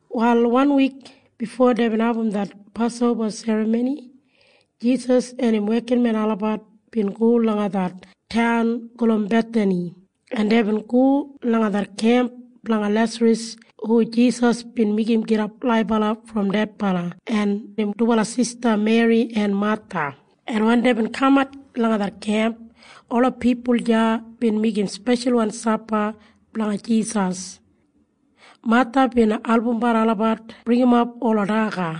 Wal wanwik bifo deibin abum det Pasoba Serramoni, Jisas en im wekinmen olabat bin go langa det taun gulum Bethani, en deibin go langa det kemp blanga Lesaras hu Jisas bin meigim gidap laibala brom dedbala en im dubala sista Meri en Matha, en wen deibin kamat langa det kemp, ola pipul deya bin meigim speshalwan sapa blanga Jisas. Matha bin albumbat olabat bringimap ola daga,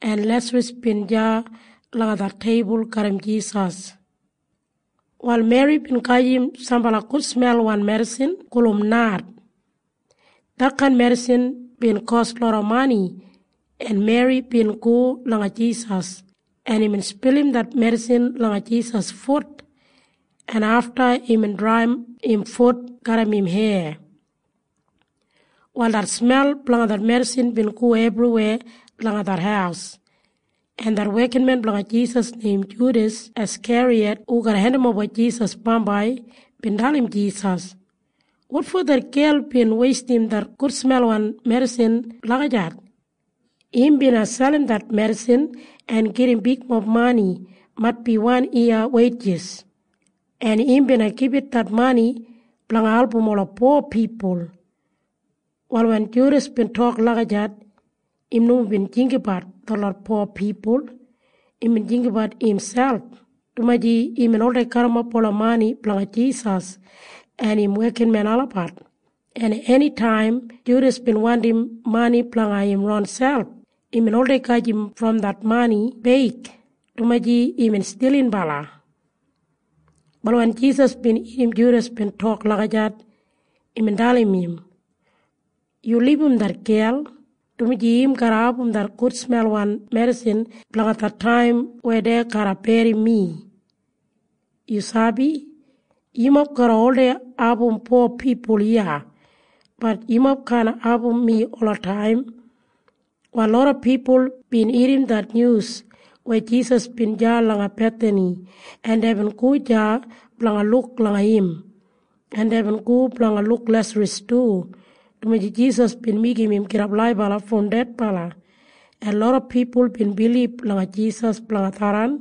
en Lesaras bin deya langa det teibul garram Jisas. Wal Meri bin gajim sambala gudsmelwan medisin gulum nard. Detkain medisin bin kos loda mani, en Meri bin go langa Jisas, en imbin spilim det medisin langa Jisas fut, en afta imbin draiyim im fut garram im heya. Wal det smel blanga det medisin bin go ebriweya langa det haus, en det wekinmen blanga Jisas neim Judas Askeriyat hu garra hendimoba Jisas bambai bin dalim Jisas, “Wotfo det gel bin weistim det gudsmelwan medisin lagijat? Im bina selim det medisin en gedim bigmob mani maitbi wan yiya weijis. En im bina gibit det mani blanga album ola po pipul.” Wal wen Judas bin tok lagijat, im nomo bin jinggabat detlot po pipul. Imbin jinggabat imselp, dumaji imbin oldei garrimap ola mani blanga Jisas en im wekinmen olabat, en enitaim Judas bin wandim mani blanga im ronselp, imbin oldei gajim brom det mani beig, dumaji imbin stilinbala. Wal wen Jisas bin irrim Judas tok lagijat, imbin dalim im, “Yu libum det gel, dumaji im garra abum det gudsmelwan medisin blanga det taim weya dei garra berrim mi. Yu sabi? Yumob garra oldei abum po pipul iya. Bat yumob kaan abum mi olataim.” Wal loda pipul bin irrim det nyus weya Jisas bin deya langa Bethani, en deibin go deya blanga luk langa im, en deibin go blanga luk Lesaras du, dumaji Jisas bin meigim im gidap laibala brom dedbala. En loda pipul bin bilib langa Jisas blanga tharran.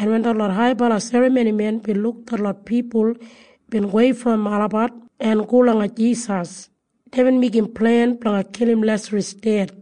En wen detlot haibala serramonimen bin luk detlot pipul bin gowei brom olabat en go langa Jisas, deibin meigim plen blanga kilim Lesaras ded.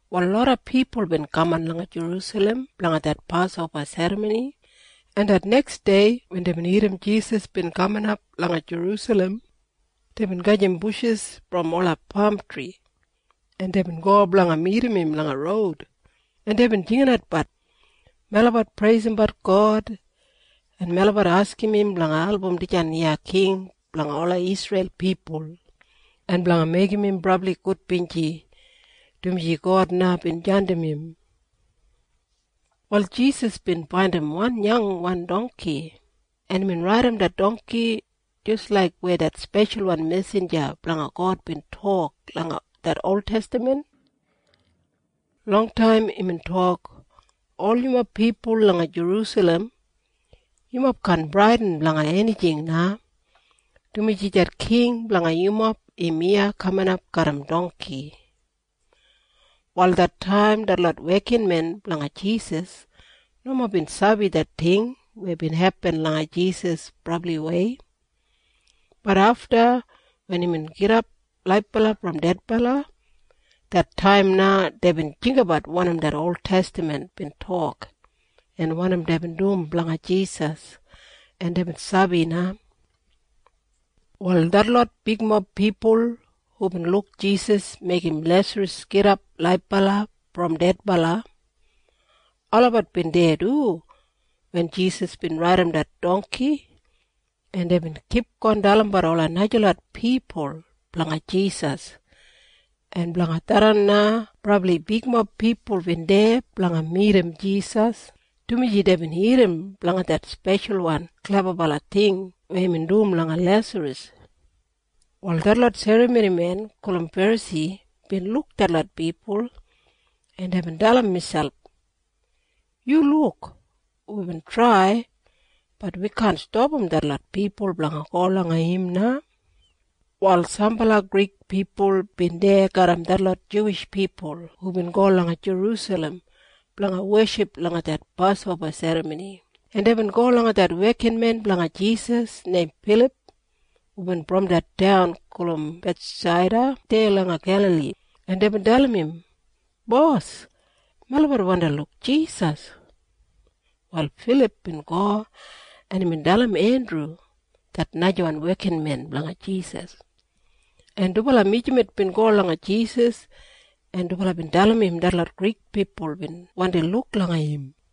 Wal loda pipul bin kaman langa Jerusalem blanga det Pasoba Serramoni, en det neksdei wen deibin irrim Jisas bin kaminap langa Jerusalem, deibin gajim bushis brom ola pamtri, en deibin go blanga midim im langa roud, en deibin jinginatbat, “Melabat preisimbat God, en melabat askim im blanga album dijan iya king blanga ola Isreil pipul en blanga meigim im brabli gudbinji, dumaji God na bin jandim im.” Wal Jisas bin faindim wan yangwan dongki, en imbin raidim det dongki jis laik weya det speshalwan mesinja blanga God bin tok langa det oltestamen. Longtaim imbin tok, “Ol yumob pipul langa Jerusalem, yumob kaan bradin blanga enijing na, dumaji det king blanga yumob im iya kaminap garram dongki.” Wal det taim detlot wekinmen blanga Jisas nomo bin sabi det ting weya bin hepin langa Jisas brabliwei. Bat afta wen imbin gidap laibala brom dedbala, det taim na deibin jinggabat wanim det oltestaman bin tok en wanim deibin dum blanga Jisas, en deibin sabi na. Wal detlot bigmob pipul hubin luk Jisas meigim Lesaras gidap laibala brom dedbala, olabat bin deya du wen Jisas bin raidim det dongki, en deibin kipgon dalimbat ola najalot pipul blanga Jisas, en blanga tharran na brabli bigmob pipul bin deya blanga midim Jisas, dumaji deibin irrim blanga det speshalwan klebabala ting weya imbin dum langa Lesaras. Wal detlot serramonimen gulum Ferasi bin luk detlot pipul, en deibin dalim miselp, “Yu luk! Wibin trai. Bat wi kaan stapam detlot pipul blanga go langa im na.” Wal sambala Grik pipul bin deya garram detlot Juwish pipul hubin go langa Jerusalem blanga weship langa det Pasoba Serramoni, en deibin go langa det wekinmen blanga Jisas neim Filip hubin brom det taun gulum Bethsaida deya langa Gelali, en deibin dalim im, “Bos, melabat wandi luk Jisas.” Wal Filip bin go en imbin dalim Endru det najawan wekinmen blanga Jisas, en dubala mijamet bin go langa Jisas, en dubala bin dalim im detlot Grik pipul bin wandi luk langa im.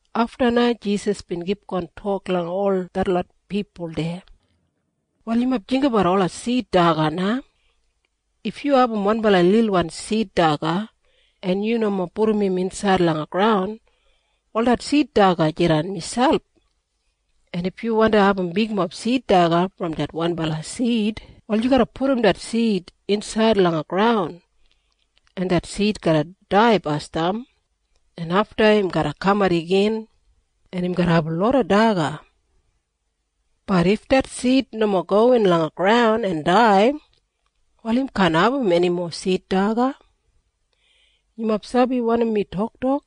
Afta na Jisas bin kipgon tok langa ol detlot pipul deya, “Wal yumob jinggabat ola sid daga na. If yu abum wanbala lilwan sid daga, en yu nomo pudum im insaid langa graun, wal det sid daga jidan miselp. En if yu wandi abum bigmob sid daga brom det wanbala sid, wal yu garra pudum det sid insaid langa graun, en det sid garra dai basdam, en afta im garra kamat igin, en im garra abum loda daga. Bat if det sid nomo gowin langa graun en dai, wal im kaan abum enimo sid daga. “Yumob sabi wanim mi toktok?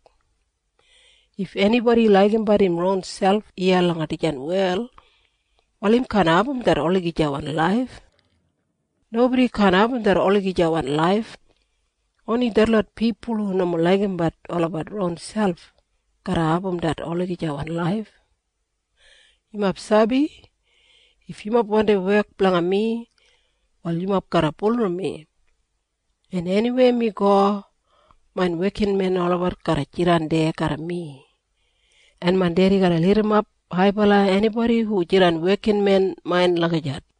If enibodi laigimbat im ronselp iya langa dijan wel, wal im kaan abum det olagijawan laif. Nobodi kaan abum det olagijawan laif. Oni detlot pipul hu nomo laigimbat olabat ronselp garra abum det olagijawan laif. “Yumob sabi? If yumob wandi wek blanga mi, wal yumob garra bulurrum mi. En eniweya mi go, main wekinmen olabat garra jidan deya garram mi. En main Dedi garra lidimap haibala enibodi hu jidan wekinmen main lagijat.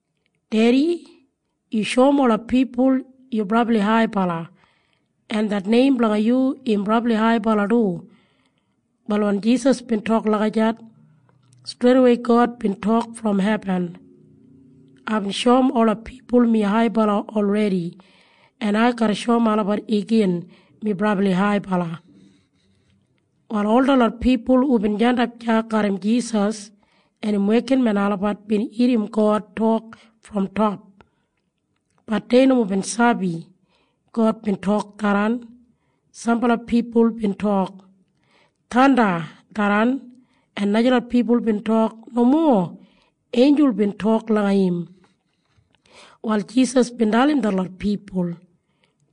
“Dedi, yu shoum ola pipul yu brabli haibala, en det neim blanga yu im brabli haibala du.” Wal wen Jisas bin tok lagijat, streidawei God bin tok brom hebin, “Aibin shoum ola pipul mi haibala olredi, en ai garra shoum olabat igin mi brabli haibala.” Wal ol detlot pipul hubin jandap deya garram Jisas en im wekinmen olabat bin irrim God tok brom top. Bat dei nomo bin sabi God bin tok tharran. Sambala pipul bin tok, “Thanda tharran.” En najalot pipul bin tok, “Nomo. Einjul bin tok langa im.” Wal Jisas bin dalim detlot pipul,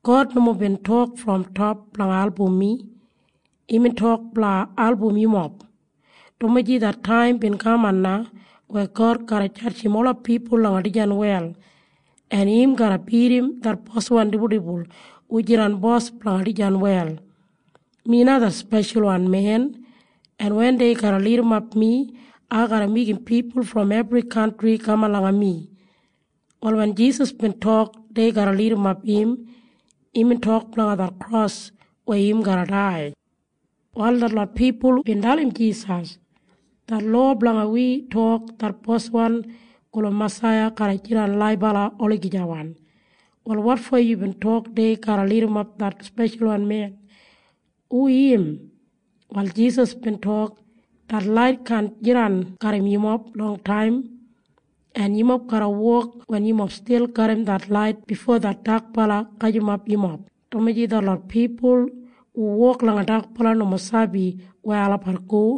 “God nomo bin tok brom top blanga album mi. Imbin tok blanga album yumob, dumaji det taim bin kaman na weya God garra jadjim ola pipul langa dijan wel, en im garra bidim det boswan dibuldibul hu jidan bos blanga dijan wel. Mi na det Speshalwan Men, en wen dei garra lidimap mi, ai garra meigim pipul brom ebri kantri kaman langa mi.” Wal wen Jisas bin tok dei garra lidimap im, imbin tok blanga det kros weya im garra dai. Wal detlot pipul bin dalim Jisas, “Det lowa blanga wi tok det Boswan gulum Masaiya garra jidan laibala olagijawan. Wal wotfo yubin tok dei garra lidimap det Speshalwan Men? Hu im?” Wal Jisas bin tok, “Det lait kaan jidan garram yumob longtaim. En yumob garra wok wen yumob stil garram det lait bifo det dakbala gajimap yumob, dumaji detlot pipul hu wok langa dakbala nomo sabi weya olabat go.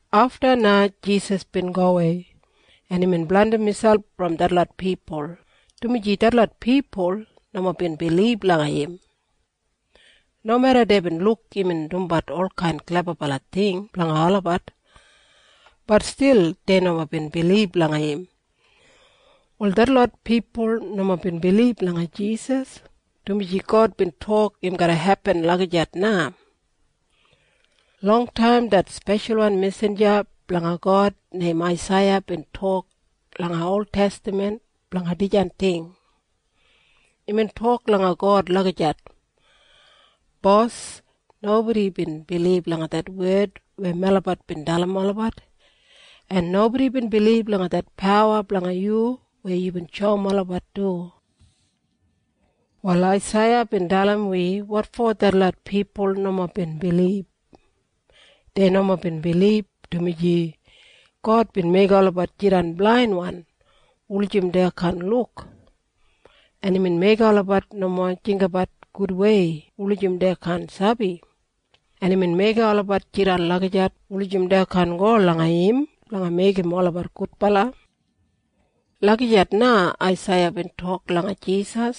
Afta na Jisas bin gowei, en imbin blandim miselp brom detlot pipul, dumaji detlot pipul nomo bin bilib langa im. Nomeda deibin luk imbin dumbat olkain klebabala ting blanga olabat, bat stil dei nomo bin bilib langa im. Wal detlot pipul nomo bin bilib langa Jisas, dumaji God bin tok im garra hepin lagijat na. Longtaim det speshalwan mesinja blanga God neim Aisaiya bin tok langa oltestaman blanga dijan ting. Imbin tok langa God lagijat, “Bos, nobodi bin bilib langa det wed weya melabat bin dalim olabat, en nobodi bin bilib langa det pawa blanga yu weya yubin shoum olabat du.” Wal Aisaiya bin dalim wi wotfo detlot pipul nomo bin bilib. Dei nomo bin bilib, dumaji “God bin meigim olabat jidan blainwan wulijim dei kaan luk, en imbin meigim olabat nomo jinggabat gudwei wulijim dei kaan sabi, en imbin meigim olabat jidan lagijat wulijim dei kaan go langa im blanga meigim olabat gudbala.” Lagijat na Aisaiya bin tok blanga Jisas,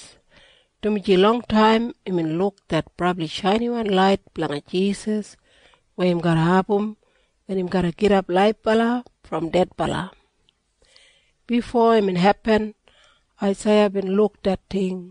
dumaji longtaim imbin luk det brabli shainiwan lait blanga Jisas weya im garra abum wen im garra gidap laibala brom dedbala. Bifo imbin hepin Aisaiya bin luk det ting.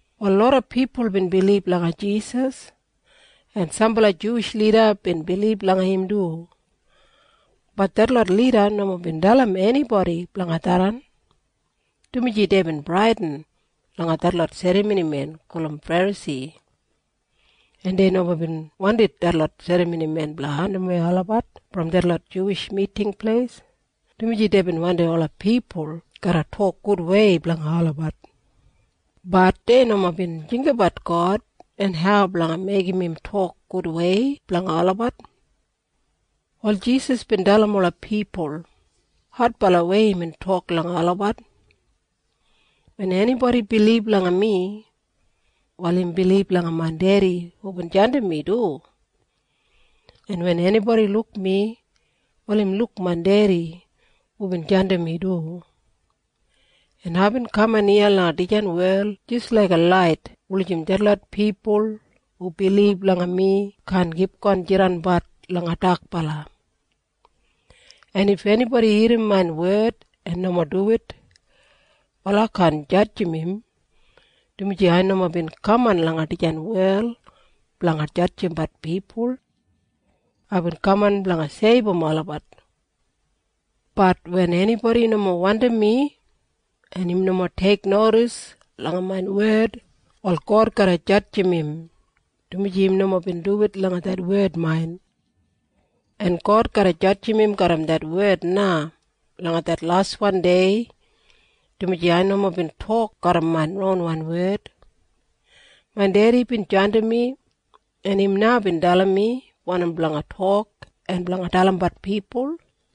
Wal loda pipul bin bilib langa Jisas, en sambala Juwish lida bin bilib langa im du. Bat detlot lida nomo bin dalim enibodi blanga tharran, dumaji deibin bradin langa detlot serramonimen gulum Ferasi, en dei nomo bin wandim detlot serramonimen blanga andimwei olabat brom detlot Juwish Miting Pleis, dumaji deibin wandim ola pipul garra tok gudwei blanga olabat. Bat dei nomo bin jinggabat God en hau blanga meigim im tok gudwei blanga olabat. Wal Jisas bin dalim ola pipul. Adbalawei imbin tok langa olabat, “Wen enibodi bilib langa mi, wal im bilib langa main Dedi hubin jandim mi du. En wen enibodi luk mi, wal im luk main Dedi hubin jandim mi du. En aibin kaman iya langa dijan wel jis laiga lait wulijim detlot pipul hu bilib langa mi kaan kipgon jidanbat langa dakbala. En if enibodi irrim main wed en nomo duwit, wal ai kaan jadjim im, dumaji ai nomo bin kaman langa dijan wel blanga jadjimbat pipul. Aibin kaman blanga seibum olabat. Bat wen enibodi nomo wandim mi, en im nomo teiknodis langa main wed, wal God garra jadjim im, dumaji im nomo bin duwit langa det wed main. En God garra jadjim im garram det wed na langa det laswan dei, dumaji ai nomo bin tok garram main ronwan wed. Main Dedi bin jandim mi, en im na bin dalim mi wanim blanga tok en blanga dalimbat pipul.